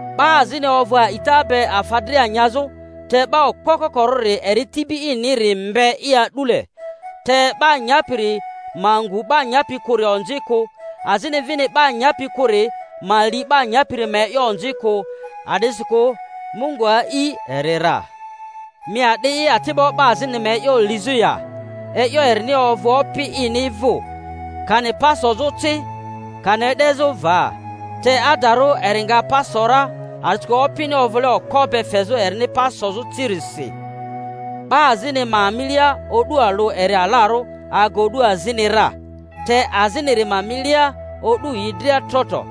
'Ba azini ovᴜ a'ita be afa dria nyazᴜ, te 'ba okpo kokorᴜri eri tibi iniri mbe'i a'dule. Te 'ba nyapiri ma ngu 'ba nyapi kᴜri onzi kᴜ, azini vini 'ba nyapi kᴜri ma li 'ba nyapiri ma e'yo onzi kᴜ; a'disikᴜ Mungu a'i eri ra. Mi a'di'i ati'bo 'ba azinini ma e'yo lizᴜ ya? E'yo erini ovᴜ opi ini vᴜ, kani pa sozᴜ ci, kani e'dezᴜ va. Te adarᴜ eri nga pa so ra, a'disikᴜ Opini ovᴜle okpo be fezᴜ erini pa sozᴜ cirisi. 'Ba azini ma milia o'du alᴜ eri alarᴜ aga o'du azini ra, te aziniri ma milia o'du yi dria tro tro.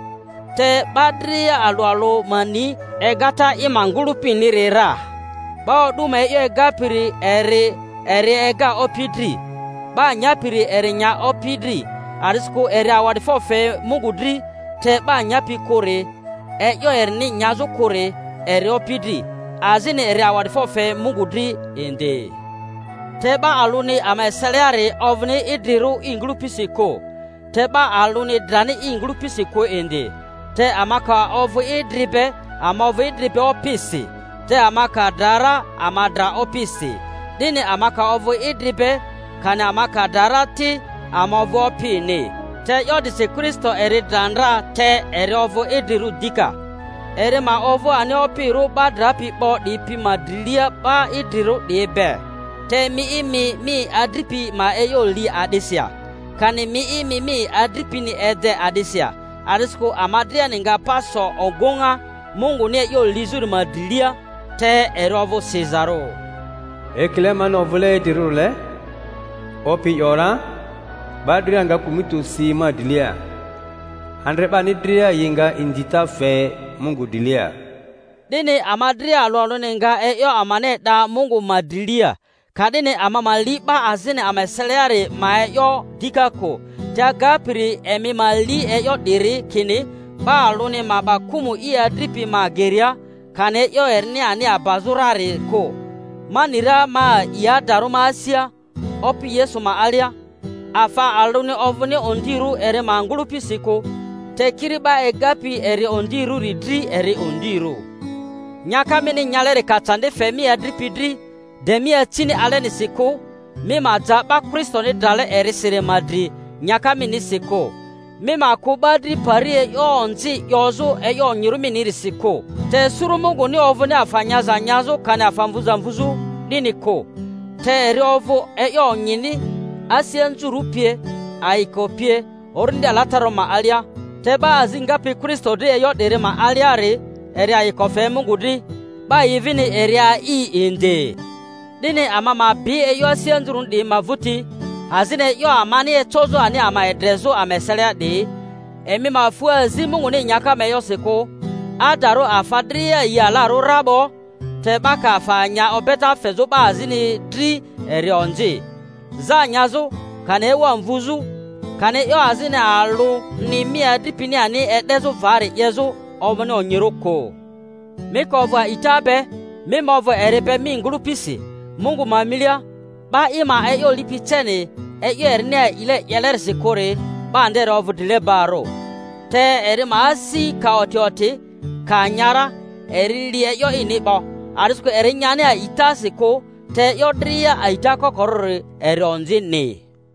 Te 'ba dria alᴜ alᴜ ma ni egata i ma ngᴜlᴜpiniri ra. 'Ba o'du ma e'yo egapiri eri eri ega Opi dri. 'Ba nyapiri eri nya Opi dri, a'disikᴜ eri awa'difo fe Mungu dri; te 'ba nyapi kᴜri, e'yo erini nyazᴜ kᴜri eri Opi dri, azini eri awa'difo fe Mungu dri indi. Te 'ba alᴜni ama eseliari ovᴜni idrirᴜ i ngᴜlᴜpisi kᴜ, te 'ba alᴜni drani i ngᴜlᴜpisi kᴜ indi. Te ama ka ovᴜ idri be ama ovᴜ idri be Opisi, te ama ka dra ra ama dra Opisi; 'dini ama ka ovᴜ idri be kani ama ka dra ra ti, ama ovᴜ Opini. Te e'yo 'disi Kristo eri dra ndra te eri ovᴜ idrirᴜ dika, eri ma ovᴜ ani Opirᴜ 'ba drapi 'bo 'diyi pi ma drilia 'ba idrirᴜ 'diyi be. Te mi'i, mi mi adripi ma e'yo li a'disi ya? Kani mi'i, mi mi adripini ede a'disi ya? A'disikᴜ ama driani nga pa so ogᴜŋa Munguni e'yo lizᴜri ma drilia; te eri ovᴜ sizarᴜ, Ekile mani ovᴜle idrirᴜrile, Opi ‘yora, 'ba dria nga kᴜmᴜti osi ma drilia, andre 'bani dria yi nga inzita fe Mungu drilia. 'Dini ama dria alᴜ alᴜni nga e'yo amani e'da Mungu ma drilia. Ka'dini ama ma li 'ba azini ama eseliari ma e'yo dika kᴜ, te agapiri emi ma li e'yo 'diri, kini 'ba alᴜni ma 'ba kᴜmᴜ i adripi ma geria, kani e'yo erini ani abazᴜ rari kᴜ. Ma ni ra, ma a'i adarᴜ ma asia Opi Yesu ma alia, afa alᴜni ovᴜni ondirᴜ eri ma ngᴜlᴜpisi kᴜ; te kiri 'ba egapi eri ondirᴜri dri eri ondirᴜ. Nyaka mini nyaleri ka candi fe mi adripi dri, de mi acini alesi kᴜ. Mi ma ja 'ba Kristoni drale erisiri ma dri nyaka minisi kᴜ. Mi ma kᴜ 'ba dri pari e'yo onzi 'yozᴜ e'yo onyirᴜ minirisi kᴜ. Te suru Munguni ovᴜni afa nyaza nyazᴜ kani afa mvuza mvuzᴜ, 'dini kᴜ, te eri ovᴜ e'yo onyini, asi anzurᴜ pie, ayiko pie, Orindi Alatararᴜ ma alia; te 'ba azi ngapi Kristo dri e'yo 'diri ma aliari, eri ayiko fe Mungu dri, 'ba yi vini eri a'i indi. 'Dini ama ma bi e'yo asi anzurᴜni 'diyi ma vᴜti, azini e'yo amani ecozᴜ ani ama edre-zᴜ ama eselia 'diyi. Emi ma fu azi Munguni nyaka ma e'yosi kᴜ. Adarᴜ afa dria yi alarᴜ ra 'bo, te 'ba ka afa nya obeta fezᴜ 'ba azini dri eri onzi; za nyazᴜ, kani ewa mvuzᴜ, kani e'yo azini alᴜni mi adripini ani e'dezᴜ vari 'yezᴜ, ovᴜni onyirᴜ kᴜ. Mi ka ovᴜ a'ita be, mi ma ovᴜ eri be mi ngᴜlᴜpisi Mungu ma milia; 'ba i ma e'yo lipi ceni e'yo erini a'ile 'yelerisi kᴜri, 'ba nderi ovᴜ drile-barᴜ. Te eri ma asi ka oti oti, ka nya ra, eri li e'yo ini 'bo, a'disikᴜ eri nyani a'itasi kᴜ; te e'yo dria a'ita kokori eri onzini.